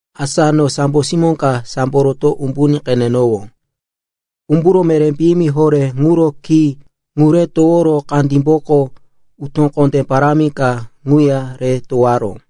Asa no sambo simó ka sambo roto umbuní qenenowó. Umburo meré piyimi horé ŋuro ki ŋu re toworo kandímboko utó kondé parámi ka ŋuya re towoyaró.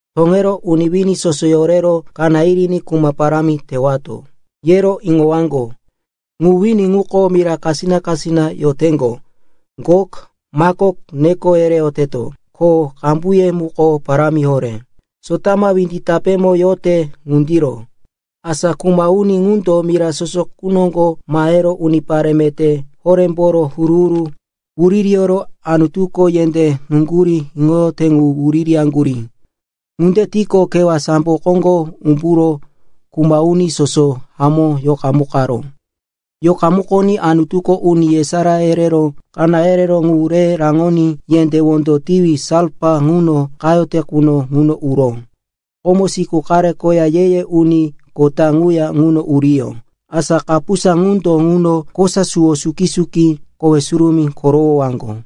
Toŋero, uni wini soso yorero kaná yiriní kuma parámi tewato, yero iŋowaŋgo. Ŋu wini ŋuko mira kasina-kasina yoteŋgo, Gok, Makok neko yereyoteto, ko qambuye muko parámi horé, sotama windi tapémo yote ŋundiro. Asa kuma uni ŋundo mira soso qu noŋgo mahero unipare meté horémboro huru-huru wuririyoro Anutuko yendé nuŋgurí iŋoyote ŋu wuririyaŋgurí. Ŋunde tiqo, kewá sambo koŋgo umburo kuma uni soso hamó yoqamukaró. Yoqamukoní Anutuko uni yesará yerero kaná yereró ŋu re raŋoní yendé wondo tiwi salfa ŋuno qayote quno ŋuno uró. Komo siku qare koya ye-ye uni kota ŋuya ŋuno uriyó. Asa kapusa ŋundo ŋuno kosa suwo suki-suki kowe surumí korowoyowaŋgo.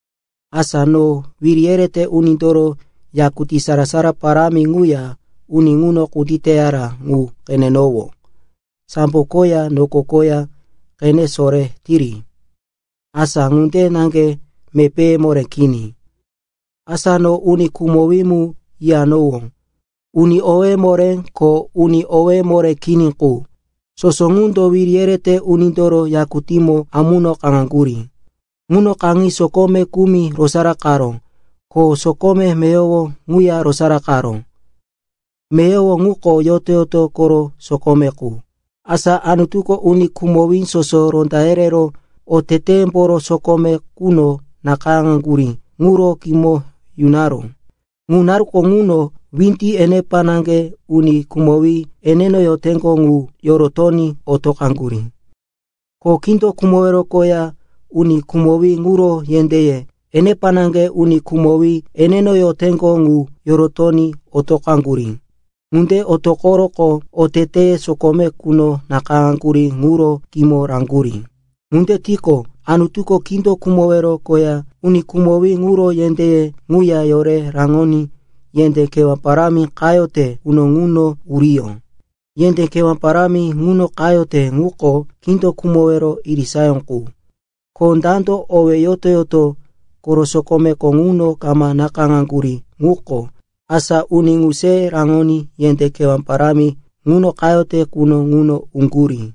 Asa no wiri yerete unindoro yakutí sara-sara parámi ŋuya uni ŋuno kunditeyara ŋu qenenowó. Sambo koya noko koya qene sore tiri, asa ŋunde naŋge mepéye moré kini. Asa no uni khumowí mu yiyanowó, uni owéye moré ko uni owéye moré kini qu, soso ŋundo wiri yerete unindoro yakutímo amuno kaŋaŋgurí. Ŋuno kaŋi sokome kumi rosaraqaró, ko sokome meyowo ŋuya rosaraqaró. Meyowo ŋuko yoto-yoto koro sokome qu. Asa Anutuko uni khumowí soso ronda yerero oteteyemboro sokome quno nakayáŋaŋgurí ŋuro kimo yunaró. Ŋu naruko ŋuno windi enepa naŋge uni khumowí eneno yoteŋgo ŋu yorotoní otoqaŋgurí. Ko kindo khumowero koya uni khumowí ŋuro yendéye enepa naŋge uni khumowí eneno yoteŋgo ŋu yorotoní otoqaŋgurí. Ŋunde otoqoroqo oteteye sokome quno nakayáŋaŋgurí ŋuro kimo raŋgurí. Ŋunde tiqo, Anutuko kindo khumowero koya uni khumowí ŋuro yendéye ŋuya yore raŋoní yendé kewá parámi qayote quno ŋuno uriyó. Yendé kewá parámi ŋuno qayote ŋuko kindo khumowero irisayó qu. Ko dando owéye yoto-yoto koro sokomeko ŋuno kama nakayáŋaŋgurí quko, asa uni ŋu se raŋoní yendé kewá parámi ŋuno qayote quno ŋuno uŋgurí.